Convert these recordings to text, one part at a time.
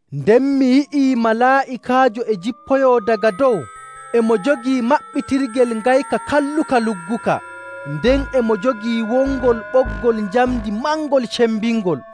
Nden mi yi'i malaa'ikaajo e jippoyoo daga dow e mo jogii maɓɓitirgel ngayka kalluka lugguka, nden e mo jogii wongol ɓoggol njamndi mangol cembingol.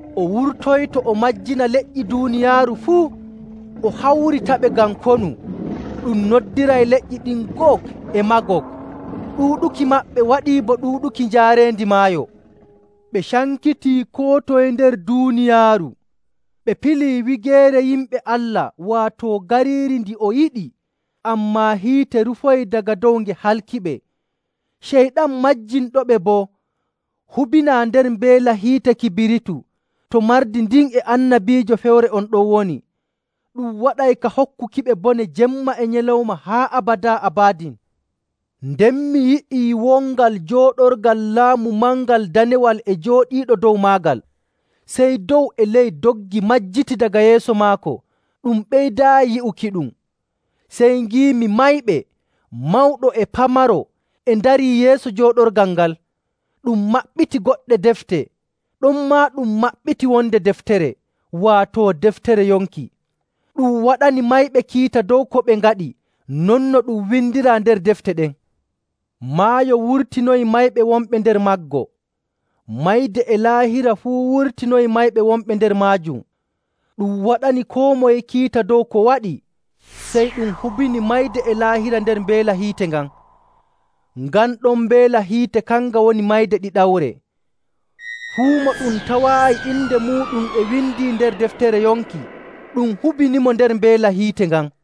O wurtoyto o majjina leƴƴi duuniyaaru fuu, o hawritaɓe ngam konu. Ɗum noddiray leƴƴi ɗin Gog e Maagog. Ɗuuɗuki maɓɓe waɗii bo ɗuuɗuki njaareendi maayo. Ɓe cankitii koo toye nder duuniyaaru, ɓe pilii wigeere yimɓe Allah, waato gariiri ndi o yiɗi. Ammaa hiite rufoyi daga dow nge halkiɓe. Ceyɗan majjinɗoɓe boo hubinaa nder mbeela hiite kibiritu to mardi ndin e annabiijo fewre on ɗon woni. Ɗum waɗay ka hokkukiɓe bone jemma e nyalawma haa abadaa abadin. Nden mi yi'ii wongal jooɗorgal laamu mangal danewal e jooɗiiɗo dow maagal. Sey dow e ley doggi majjiti daga yeeso maako ɗum ɓeydaayi yi'ukiɗum. Sey ngiimi mayɓe, mawɗo e pamaro, e ndarii yeeso jooɗorgal ngal, ɗum maɓɓiti goɗɗe defte. Ɗonmaa ɗum maɓɓiti wonde deftere, waato deftere yonki. Ɗum waɗani mayɓe kiita dow ko ɓe ngaɗi non no ɗum windiraa nder defte ɗen. Maayo wurtinoyi mayɓe wonɓe nder maggo. Mayde e Laahira fuu wurtinoyi mayɓe wonɓe nder maajum. Ɗum waɗani koo moye kiita dow ko waɗi. Sey ɗum hubini Mayde e Laahira nder mbeela hiite ngan. Ngan ɗon mbeela hiite kanga woni mayde ɗiɗawre. Fuu mo ɗum tawaayi inde muuɗum e windii nder deftere yonki, ɗum hubinimo nder mbeela hiite ngan.